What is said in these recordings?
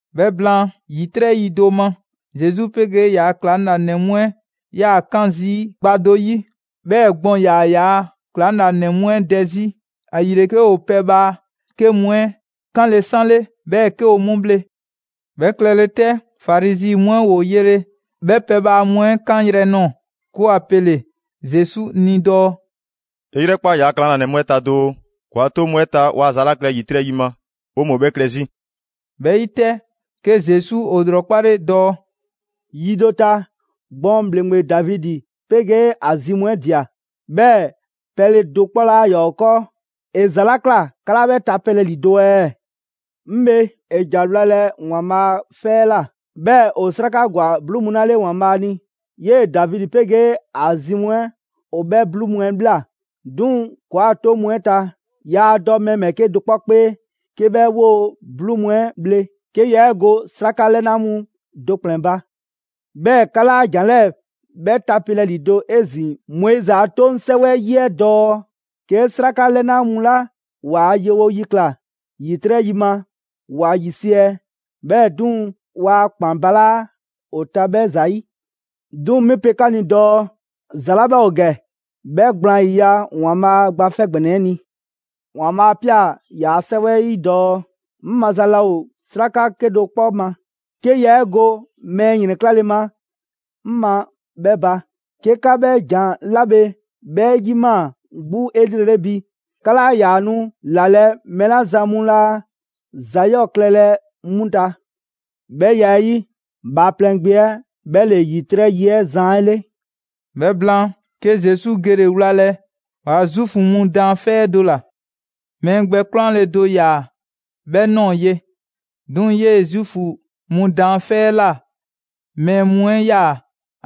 'Bhɛ blaan, ‑yitrɛ' yi do ma, Zesu 'pegee ‑yaa' ‑klaŋlanɛ mu 'ɛ 'yaa‑ 'kan zii' gba do 'yi. 'Bhɛɛ‑ gbɔn ‑yaa ‑yaa' ‑klaŋlanɛ mu 'ɛ dɛ 'zi; ‑ayile 'ke ‑o pɛbhaa 'ke mu 'ɛ 'kanle‑ 'sanle 'bhɛɛ‑ 'ke ‑o 'mu bhle. 'Bhɛ klɛle 'tɛ, Farizi mu 'ɛ ‑woo yele 'bhɛ pɛbhaa mu 'ɛ 'kan yrɛ ꞊nɔɔ, 'ke ‑wa pele‑ Zesu ni dɔɔ: «'E 'yrɛkpa 'yaa‑ ‑klaŋlanɛ mu 'ɛ ta doo, ‑kɔɔa' a 'toŋ mu 'ɛ ta waa ‑za 'la klɛ ‑yitrɛ' yi ma, 'woo‑ mu ‑o 'bhɛɛ‑ klɛ 'zi!» 'Bhɛ 'yi 'tɛ, 'ke Zesu ‑o ‑lrɔkpale dɔɔ: «Yi do ta, gbɔn ‑bhleŋgbe Davidi 'pegee ‑a zi mu 'ɛ ꞊dia, 'bhɛɛ‑ pɛle dɔ 'kpɔ 'laa ‑yaa ‑o 'kɔɔ. ‑E ‑za 'la ꞊kla 'ka 'laa 'bhɛ tapelɛ ‑lido' ɛɛ? 'Ŋ bhe, ‑e ‑ja wlalɛ ‑Waanbhaa' 'fɛ 'ɛ ꞊la. 'Bhɛɛ‑ ‑o 'sraka ‑gwa 'bluu mu 'la 'le ‑Waanbhaa' ni, 'yee‑ Davidi 'pegee ‑a zi mu 'ɛ ‑o 'bhɛ 'bluu mu 'ɛ ꞊bhla. 'Duŋ‑ ‑kɔɔa' 'toŋ mu 'ɛ ta, yaa dɔ mɛɛ ‑bhɛɛke' do 'kpɔ 'kpee 'ke 'bhɛ 'woo‑ 'bluu mu 'ɛ bhle; 'ke yaa 'e go 'sraka 'lɛna mu do ‑kplɛn ba. 'Bhɛɛ‑ 'ka 'laa ‑jan 'lɛɛ‑ 'bhɛ tapelɛ ‑lido' 'ezin‑ Moizi a 'toŋ 'sɛwɛ 'ɛ 'yi ɛɛ dɔɔ: ‹'Ke 'sraka 'lɛna mu 'la ‑waa' yewo yi ꞊kla ‑yitrɛ' yi ma, ‑wa ‑yisiɛ'; 'bhɛɛ‑ 'duŋ‑, waa ‑kpan balaa' ‑o ta 'bhɛ ‑zayi'.› 'Duŋ‑ 'mi pe 'ka ni dɔɔ ‑za 'la 'bhɛ ‑o ‑gɛ 'bhɛ gblaan ‑yiya' ‑Waanbhaa' Gba 'Fɛ ‑Gbɛnɛ 'ɛ ni! ‑Waanbhaa' 'a ꞊pia ‑yaa' 'Sɛwɛ 'ɛ 'yi dɔɔ: ‹'Ŋ maza laa ‑o 'sraka 'kedo‑ 'kpɔ ma, 'ke yaa 'e go mɛɛ ‑yrɛnklale ma 'ŋ ma 'bhɛ ba.› 'Ke 'ka 'bhɛ ‑jan 'la bhe 'bhɛ 'yimaa‑ 'gbu 'elrele bi, 'ka 'laa ‑yaa nu ‑lalɛ' mɛɛ 'la zan mu 'laa ‑za 'yɔɔ‑ klɛlɛ 'mu ta. 'Bhɛ ya 'ɛ 'yi, Bhaaplɛŋ Gbe 'ɛ 'bhɛ ‑le ‑yitrɛ' 'yi 'ɛ Zan 'ɛ 'le.» 'Bhɛ blaan, 'ke Zesu gele‑ wlalɛ ‑waa' Zuufu mu daanfɛ' 'ɛ do ‑la. Mɛɛ gbɛ 'kwlanle‑ do ‑yaa' 'bhɛ ꞊nɔɔ ye. 'Duŋ‑ 'yee‑ Zuufu mu daanfɛ' 'ɛ ꞊la mɛɛ mu 'ɛ 'yaa‑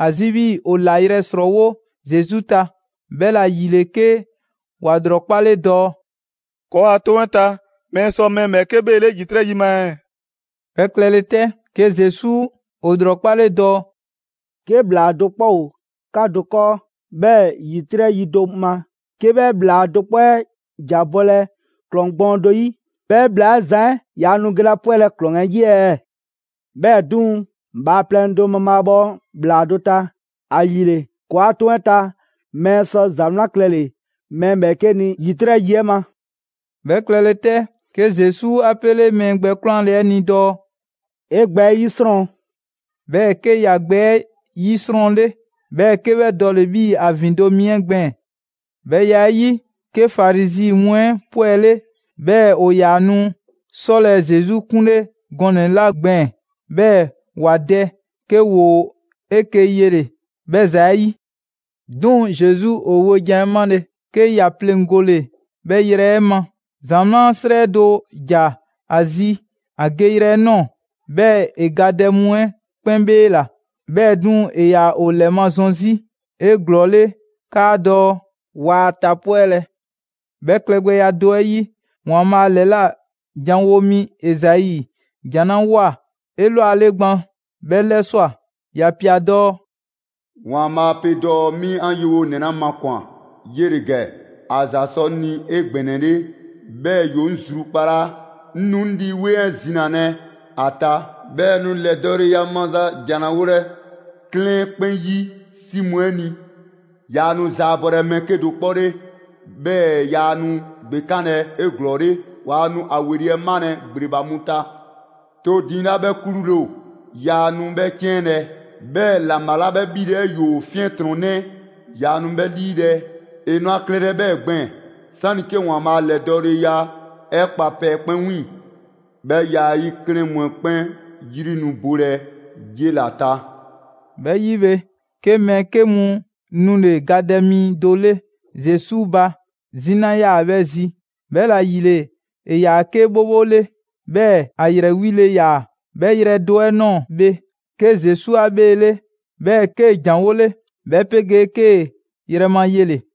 ‑a zi 'bhii‑ ‑o ‑layrɛ' ‑srɔɔwo' Zesu ta, 'bhɛla‑ ‑yile 'ke ‑wa ‑lrɔkpale dɔɔ: «‑Kɔɔa' 'toŋ 'ɛ ta mɛɛ sɔ mɛɛ ‑bhɛɛke' 'bheele ‑yitrɛ' yi ma ɛɛ?» 'Bhɛ klɛle 'tɛ, 'ke Zesu ‑o ‑lrɔkpale dɔɔ: «'Ke ‑bhlaa do 'kpɔ ‑o 'ka do 'kɔɔ, 'bhɛɛ‑ ‑yitrɛ' yi do ma, 'ke 'bhɛ ‑bhlaa do 'kpɔ 'ɛ ‑ja bɔlɛ ‑klɔŋ gbɔɔn do 'yi; 'bhɛ ‑bhlaa 'ɛ zan 'ɛ yaa nu gelɛ ‑a 'pwɛlɛ‑ ‑klɔŋ 'ɛ 'yi ɛɛ? 'Bhɛɛ‑ 'duŋ‑, bhaaplɛŋ do mabhaabhɔ ‑bhlaa do ta. ‑Ayile, ‑kɔɔa' 'toŋ 'ɛ ta mɛɛ sɔ ‑za 'wlan klɛle‑ mɛɛ ‑bhɛɛke' ni ‑yitrɛ' yi 'ɛ ma.» 'Bhɛ klɛle 'tɛ, 'ke Zesu 'a 'pele mɛɛ gbɛ 'kwlanle‑ 'ɛ ni dɔɔ: «'E gbɛ 'ɛ 'yisrɔn!» 'Bhɛɛ‑ 'ke ‑ya gbɛ 'ɛ 'yisrɔnle, 'bhɛɛ‑ 'ke 'bhɛ dɔɔle‑ 'bhii‑ ‑a ‑vin do mi 'ɛ gbɛɛn‑. 'Bhɛ ya 'ɛ 'yi, 'ke Farizi mu 'ɛ 'pwɛle, 'bhɛɛ‑ ‑o ‑yaa nu 'sɔlɛ‑ Zesu 'kunle gɔnɛ‑ 'la gbɛɛn‑ 'bhɛɛ‑ ‑wa dɛ, 'ke ‑woo 'eke‑ yele‑ 'bhɛ ‑za 'ɛ 'yi. 'Duŋ‑, Zesu ‑o wojan 'ɛ 'male‑, 'ke ‑ya pleŋgole 'bhɛ yrɛ 'ɛ ma. ‑Zamaa' 'srɛ do ‑ja ‑a zi ‑a geyrɛ 'ɛ ꞊nɔɔ; 'bhɛɛ‑ ‑e gadɛ mu 'ɛ 'kpɛn 'bheela‑. 'Bhɛɛ‑ 'duŋ‑, ‑e ‑yaa ‑o ‑lɛmazɔn 'zi 'eglɔɔle 'kaadɔɔ‑ waa a tapwɛlɛ. 'Bhɛ klɛgbɛya do 'ɛ 'yi, ‑Waanbhaa' ‑lɛla' janwo mi Ezai ‑jan 'la ꞊woa 'elwale gban 'bhɛ 'lɛswa‑; ‑ya ꞊pia dɔɔ: «‑Waanbhaa' pe dɔɔ 'mi 'an yewonɛ 'la makwan‑ 'yele‑ ‑gɛ. ‑A ‑za sɔ 'ŋ ni 'egbɛnɛle, 'bhɛɛ‑ ‑yoo 'ŋ zrukpalaa. 'Ŋ nu 'ŋ Lii 'Weŋ 'ɛ zinalɛ ‑a ta, 'bhɛɛ‑ ‑e nu ‑lɛdɔɔleya maza ‑jan ‑la wolɛ 'klɛɛn 'ɛ 'kpɛn 'yi 'si mu 'ɛ ni. Yaa nu zaabɔlɛ mɛɛ 'kedo‑ 'kpɔ 'le, 'bhɛɛ‑ yaa nu ‑gbekanlɛ 'eglɔɔle. Waa nu a ‑weli' 'ɛ malɛ ‑gbleba mu ta. To diiŋ 'la 'bhɛ 'klule‑ ‑o, yaa nu 'bhɛ 'ciɛnlɛ‑. 'Bhɛɛ‑ ‑laŋbha 'la 'bhɛ 'bhile‑ 'ɛ ‑yoo 'fiɛntrɔnnɛ, yaa nu 'bhɛ 'liilɛ‑. ‑E nu a klɛlɛ 'bhɛɛ‑ gbɛɛn‑ 'sani‑ 'ke ‑Waanbhaa' a ‑lɛdɔɔleya 'ɛ kpa pɛ 'kpɛn 'wiiŋ‑. 'Bhɛ ya 'ɛ 'yi, 'klɛɛn mu 'ɛ 'kpɛn 'yri nu bolɛ 'yela‑ ta.» 'Bhɛ 'yi bhe, 'ke mɛɛ 'ke mu nule‑ gadɛ mi do 'le Zesu ba. 'Zina ‑yaa 'bhɛ zi, 'bhɛla‑ ‑yile ‑e ‑yaa 'ke 'bhobho 'le, 'bhɛɛ‑ ‑a ‑yrɛ 'wile‑ ‑yaa. 'Bhɛ yrɛ do 'ɛ ꞊nɔɔ bhe, 'ke Zesu 'a 'bheele, 'bhɛɛ‑ 'kee‑ ‑janwole, 'bhɛ 'pegee 'kee‑ ‑yrɛ ma yele‑.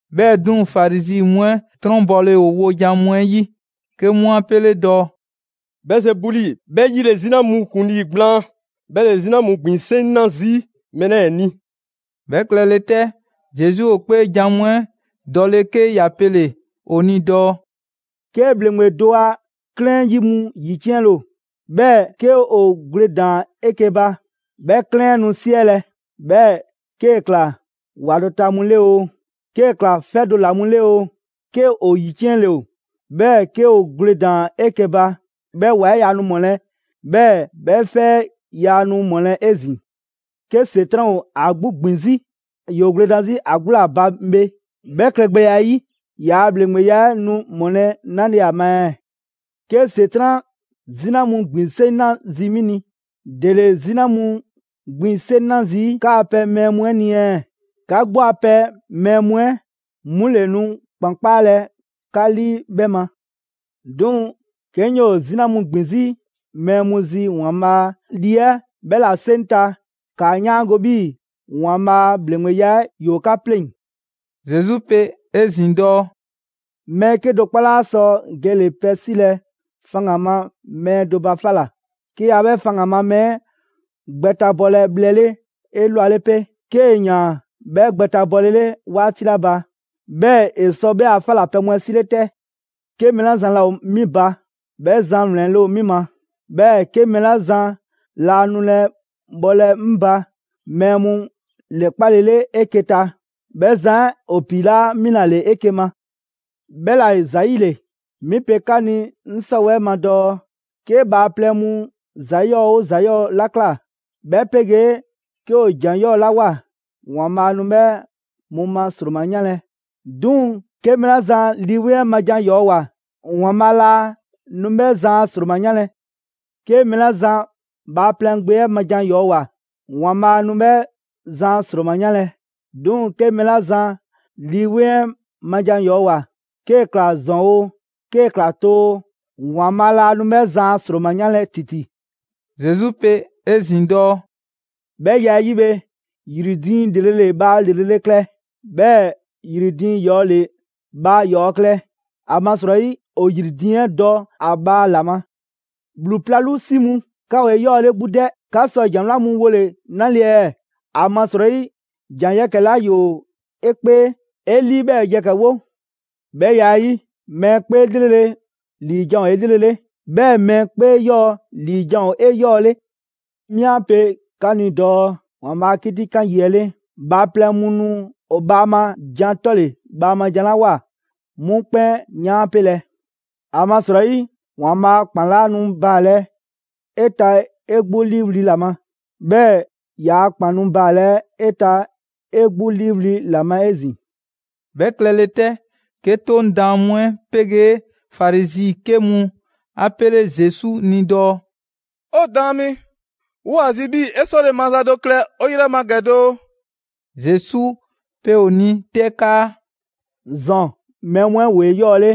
'Bhɛɛ‑ 'duŋ‑, Farizi mu 'ɛ 'trɔnbɔle ‑o wojan mu 'ɛ 'yi, 'ke 'mu 'a pele‑ dɔɔ: «Bɛɛzebuli ('bhɛ 'yi ‑le 'zina mu ‑kuŋlii gblaan), 'bhɛ ‑le 'zina mu ‑gbin 'seŋ 'na zii' mɛɛ 'lɛɛ‑ ni!» 'Bhɛ klɛle 'tɛ, Zesu ‑o 'kpeejan‑ mu 'ɛ dɔle 'ke ‑ya pele‑ ‑o ni dɔɔ: «'Ke ‑bhleŋgbe do a 'klɛɛn 'yi mu ‑yiciɛnle ‑o, 'bhɛɛ‑ 'ke ‑o gwledan 'eke‑ ba, 'bhɛ 'klɛɛn 'ɛ nu 'siɛlɛ‑. 'Bhɛɛ‑ 'kee‑ ꞊kla ‑wa do ta mu 'le 'oo, 'kee‑ ꞊kla 'fɛ do ‑la mu 'le 'oo, 'ke ‑o ‑yiciɛnle ‑o, 'bhɛɛ‑ 'ke ‑o gwledan 'eke‑ ba, 'bhɛ ‑wa 'ɛ yaa nu ‑mɔlɛ', 'bhɛɛ‑ 'bhɛ 'fɛ 'ɛ yaa nu ‑mɔlɛ' 'ezin‑. 'Ke ‑Setran' ‑o ‑a 'gbu ‑gbin 'zi, ‑yoo gwledan 'zi ‑a 'gbu ‑la ba bhe. 'Bhɛ klɛgbɛya 'ɛ 'yi, ‑yaa' ‑bhleŋgbeya 'ɛ nu ‑mɔlɛ' 'nale‑ ma ɛɛ? 'Ke ‑Setran' 'zina mu ‑gbin 'seŋ 'na zii' 'mi ni; ‑dele 'zina mu ‑gbin 'seŋ 'na zii' 'kaa‑ pɛ mɛɛ mu 'ɛ ni 'ɛ? 'Ka 'gbu a pɛ mɛɛ mu 'ɛ 'mu ‑le nu ‑kpan 'kpaalɛ‑ 'ka 'lii 'bhɛ ma. 'Duŋ‑ 'ke 'ŋ 'yoo‑ 'zina mu ‑gbin 'zi mɛɛ mu zi ‑Waanbhaa' Lii 'ɛ 'bhɛ ‑la 'seŋ ta, ‑kaa 'yaango‑ 'bhii‑ ‑Waanbhaa' a ‑bhleŋgbeya ‑yoo 'ka 'pleŋ‑.» Zesu pe 'ezin‑ dɔɔ: «Mɛɛ 'kedo‑ 'kpɔ 'laa sɔ gele‑ pɛ 'silɛ‑ faŋgan‑ ma mɛɛ do ba 'fa ꞊la, 'ke yaa 'bhɛ faŋgan‑ ma mɛɛ 'ɛ gbɛtabɔlɛ bhlɛ 'le 'elwale 'pe; 'kee‑ ‑yaan 'bhɛ gbɛtabɔlele 'waati 'la ba, 'bhɛɛ‑ ‑e sɔ 'bhɛ a 'fa ‑la pɛ mu 'ɛ 'sile 'tɛ. 'Ke mɛɛ 'la zan laa ‑o 'mi ba, 'bhɛ zan ‑wlɛnle' ‑o 'mi ma, 'bhɛɛ‑ 'ke mɛɛ 'la zan laa nulɛ bhɔlɛ 'ŋ ba mɛɛ mu ‑lɛkpalele 'eke‑ ta, 'bhɛ zan 'ɛ ‑o piilaa' mi ‑la ‑le 'eke‑ ma. 'Bhɛla‑ ‑zayile, 'mi pe 'ka ni 'ŋ 'sɔwɛɛ‑ ma dɔɔ: 'Ke bhaaplɛŋ mu ‑za 'yɔɔ‑ 'oo ‑za 'yɔɔ‑ 'la ꞊kla, 'bhɛ 'pegee 'ke ‑o ‑jan 'yɔɔ‑ 'la ꞊woa, ‑Waanbhaa' nu 'bhɛ mu ma ‑sroma 'yanlɛ‑; 'duŋ‑ 'ke mɛɛ 'la zan Lii 'Weŋ 'ɛ ma ‑jan 'yɔɔ‑ ꞊woa, ‑Waanbhaa' laa nu 'bhɛ zan a ‑sroma 'yanlɛ‑. 'Ke mɛɛ 'la zan Bhaaplɛŋ 'ɛ Gbe 'ɛ ma jan 'yɔɔ‑ ꞊woa ‑Waanbhaa' nu 'bhɛ zan a ‑sroma 'yanlɛ‑; 'duŋ‑ 'ke mɛɛ 'la zan Lii 'Weŋ 'ɛ ma jan ‑yɔɔ ꞊woa, 'kee‑ ꞊kla ‑zɔn oo, 'kee‑ ꞊kla too oo, ‑Waanbhaa' laa nu 'bhɛ zan a ‑sroma 'yanlɛ‑ ‑titi.» Zesu pe 'ezin‑ dɔɔ: «'Bhɛ ‑ya 'ɛ 'yi bhe, ‑yri diiŋ ‑lrele' ‑le bhaa ‑lrele' klɛ, 'bhɛɛ‑ ‑yri diiŋ ‑yɔɔ' ‑le bhaa ‑yɔɔ' klɛ. ‑Amasrɔyi ‑o ‑yri diiŋ 'ɛ dɔ ‑a bhaa ‑la ma. ‑Bhlu 'plalu 'si mu! 'Ka ‑o 'eyɔɔle 'gbu 'dɛ, 'ka sɔ ‑jan 'wlan mu wole‑ 'nale‑ ɛɛ? ‑Amasrɔyi ‑jan yɛkɛ‑ 'la ‑yoo 'e 'kpee, 'e 'lii 'bhɛɛ‑ yɛkɛ‑ wo. 'Bhɛ ya 'ɛ 'yi, mɛɛ 'kpee 'lrele‑ ‑liijan' ‑o 'elrele, 'bhɛɛ‑ mɛɛ 'kpee 'yɔɔ‑ ‑liijan' ‑o 'eyɔɔle. 'Mi 'a pe 'ka ni dɔɔ ‑Waanbhaa' a 'kitikan 'yi 'ɛ 'le, bhaaplɛŋ mu nu ‑o bhaama jan 'tɔle‑ bhaama jan 'la ꞊woa, 'mu 'kpɛn 'yaanpelɛ. ‑Amasrɔyi, ‑Waanbhaa' a ‑kpan 'laa nu baalɛ 'e ta 'e 'gbu 'liiwli‑ ‑la ma, 'bhɛɛ‑ ‑yaa' ‑kpan nu baalɛ 'e ta 'e 'gbu 'liiwli‑ ‑la ma 'ezin‑.» 'Bhɛ klɛle 'tɛ, 'ke 'Toŋ Daan mu 'ɛ 'pegee Farizi 'ke mu 'a 'pele Zesu ni dɔɔ: «'O Daan mi, 'woo‑ ‑a zi 'bhii‑ 'e 'sɔle‑ maza do klɛ 'o 'yrɛ ma ‑gɛ doo.» Zesu pe ‑o ni 'tɛ 'kaa: «‑Zɔn mɛɛ mu 'ɛ ‑woo 'eyɔɔle,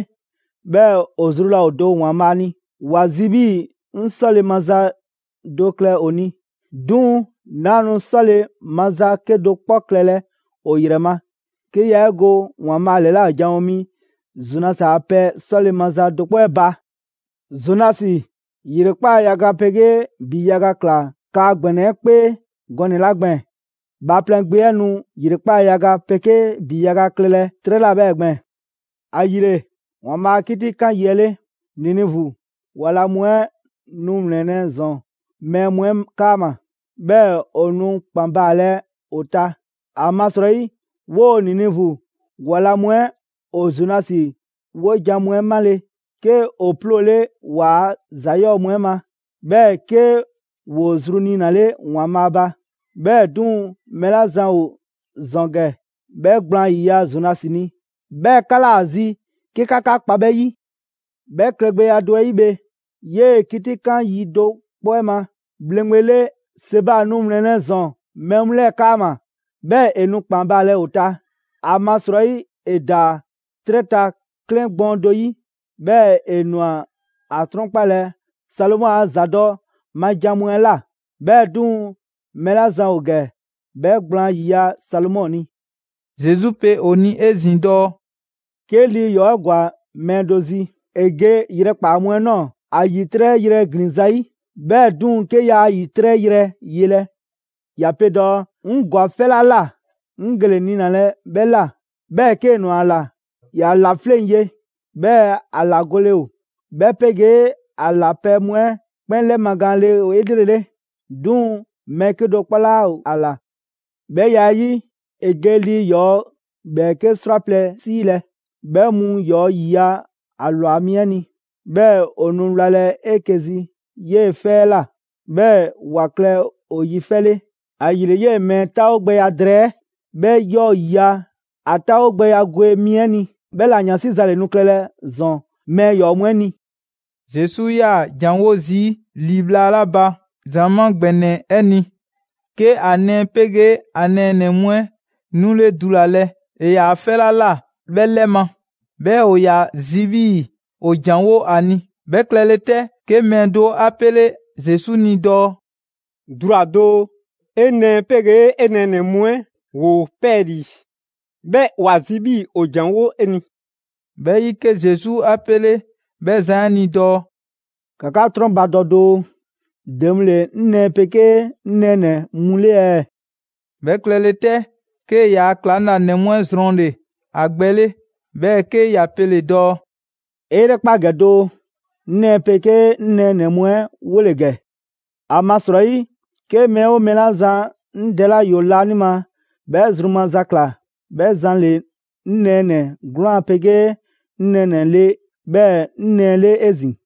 'bhɛɛ‑ ‑o zru laa ‑o do ‑Waanbhaa' ni. ‑Wa zi 'bhii‑ 'ŋ 'sɔle‑ maza do klɛ ‑o ni, 'duŋ‑ 'naa nu 'sɔle‑ maza 'kedo‑ 'kpɔ klɛlɛ ‑o ‑yrɛ ma, 'ke yaa 'e go ‑Waanbhaa' ‑lɛla' janwo mi Zonasi a pɛ 'sɔle‑ maza do 'kpɔ 'ɛ ba. Zonasi ‑yrekpaa' yaga 'pegee ‑bi yaga ꞊kla kaa ‑gbɛnɛ 'ɛ 'kpee gɔnɛ‑ 'la gbɛɛn‑, Bhaaplɛŋ Gbe 'ɛ nu ‑yrekpaa' yaga 'pegee ‑bi yaga klɛlɛ 'trɛ ꞊la 'bhɛɛ‑ gbɛɛn‑. ‑Ayile, ‑Waanbhaa' a 'kitikan yi 'ɛ 'le, Ninivu ‑wa la mu 'ɛ nu ‑wlɛnlɛ' ‑zɔn mɛɛ mu 'ɛ 'kaama‑, 'bhɛɛ‑ ‑o nu ‑kpan baalɛ ‑o ta. Amasrɔyi 'woo‑ Ninivu ‑wa la mu 'ɛ ‑o Zonasi 'wojan‑ mu 'ɛ 'male‑, 'ke ‑o 'ploole waa ‑za 'yɔɔ‑ mu 'ɛ ma, 'bhɛɛ‑ 'ke ‑woo zru 'niinale ‑Waanbhaa' ba. 'Bhɛɛ‑ 'duŋ‑, mɛɛ 'la zan ‑o ‑zɔn ‑gɛ 'bhɛ gblaan ‑yiya' Zonasi ni, 'bhɛɛ‑ 'ka 'laa ‑a zi 'ke 'ka 'ka kpa 'bhɛ ‑yi. 'Bhɛ klɛgbɛya do 'ɛ 'yi bhe, 'yee‑ 'kitikan yi do 'kpɔ 'ɛ ma, ‑bhleŋgbe le Seba nu ‑wlɛnlɛ' ‑zɔn mɛɛ mu 'lɛɛ‑ 'kaama‑, 'bhɛɛ‑ ‑e nu ‑kpan baalɛ ‑o ta. ‑Amasrɔyi ‑e ‑daa 'trɛ ta 'klɛɛn gbɔɔn do 'yi, 'bhɛɛ‑ ‑e ꞊nwa ‑a 'trɔnkpalɛ Salomɔ a ‑zadɔ' ma jan mu 'ɛ ꞊la. 'Bhɛɛ‑ 'duŋ‑, mɛɛ 'la zan ‑o ‑gɛ 'bhɛ gblaan ‑yiya' Salomɔ ni.» Zesu pe ‑o ni 'ezin‑ dɔɔ: «'Ke lii ‑yɔɔ' 'ɛ ‑gwa mɛɛ do zi, ‑e ge yrɛ ‑kpaa mu 'ɛ ꞊nɔɔ, ‑a ‑yitrɛ' yrɛ ‑glin zayi'. 'Bhɛɛ‑ 'duŋ‑, 'ke yaa ‑yitrɛ' yrɛ yelɛ, ‑ya pe dɔɔ: ‹'Ŋ ‑gwa 'fɛ 'la ꞊la, 'ŋ gele‑ niinalɛ 'bhɛ ꞊la.› 'Bhɛɛ‑ 'kee‑ ꞊nwa ‑a ‑la, ‑ya ‑la 'fleŋ‑ ye, 'bhɛɛ‑ ‑a ‑la gole ‑o, 'bhɛ 'pegee ‑a ‑la pɛ mu 'ɛ 'kpɛn 'lɛmagaanle ‑o 'elrele. 'Duŋ‑ mɛɛ 'kedo‑ 'kpɔ 'laa ‑o ‑a ‑la. 'Bhɛ ya 'ɛ 'yi, ‑e ge lii ‑yɔɔ' 'bhɛɛke 'srwaplɛ‑ 'siilɛ‑; 'bhɛ 'mu ‑yɔɔ' ‑yiya' ‑a ‑lwa mi 'ɛ ni; 'bhɛɛ‑ ‑o nu wlalɛ 'eke‑ zi 'yee‑ 'fɛ 'ɛ ꞊la, 'bhɛɛ‑ ‑wa klɛ ‑o yi 'fɛ 'le. ‑Ayile 'yee‑ mɛɛ 'ɛ 'taawogbɛya drɛɛ, 'bhɛ 'yɔɔ‑ ‑yiya' ‑a 'taawogbɛya gwe mi 'ɛ ni. 'Bhɛla‑ 'yansi za ‑le nu klɛlɛ ‑zɔn mɛɛ ‑yɔɔ' mu 'ɛ ni.» Zesu 'yaa‑ ‑janwo' zii' ‑li bhla 'la ba ‑zamaa' ‑gbɛnɛ 'ɛ ni, 'ke ‑a nɛɛ 'pegee ‑a nɛɛnɛ‑ mu 'ɛ 'nule dulalɛ ‑e ‑yaa 'fɛ 'la ꞊la 'bhɛ 'lɛ ma. 'Bhɛɛ‑ ‑o ‑yaa zi 'bhii‑ ‑o ‑janwo' 'a ni. 'Bhɛ klɛle 'tɛ, 'ke mɛɛ do 'a 'pele Zesu ni dɔɔ: «Dula‑ doo, 'e nɛɛ 'pegee 'e nɛɛnɛ‑ mu 'ɛ ‑woo 'pɛɛlii‑, 'bhɛɛ‑ ‑wa zi 'bhii‑ ‑o ‑janwo' 'e ni.» 'Bhɛ 'yi, 'ke Zesu 'a 'pele 'bhɛ zan 'ɛ ni dɔɔ: «‑Ka 'ka 'trɔnbadɔ doo, ‑de mu ‑le 'ŋ nɛɛ 'pegee 'ŋ nɛɛnɛ‑ mu 'le ɛɛ?» 'Bhɛ klɛle 'tɛ, 'kee‑ yaa ‑klaŋlanɛ mu 'ɛ zrɔnle‑ ‑a gbɛ 'le, 'bhɛɛ‑ 'ke ‑ya pele‑ dɔɔ: «'E 'yrɛkpa ‑gɛ doo! 'Ŋ nɛɛ 'pegee 'ŋ nɛɛnɛ‑ mu 'ɛ 'wole‑ ‑gɛ. ‑Amasrɔyi, 'ke mɛɛ 'oo mɛɛ 'la zan 'ŋ Dɛ 'la ‑yoo laanima 'bhɛ zru maza ‑kla, 'bhɛ zan ‑le 'ŋ nɛɛnɛ‑ 'gwlaan‑ 'pegee 'ŋ nɛɛnɛ‑ le 'bhɛɛ‑ 'ŋ nɛɛ 'le 'ezin‑.»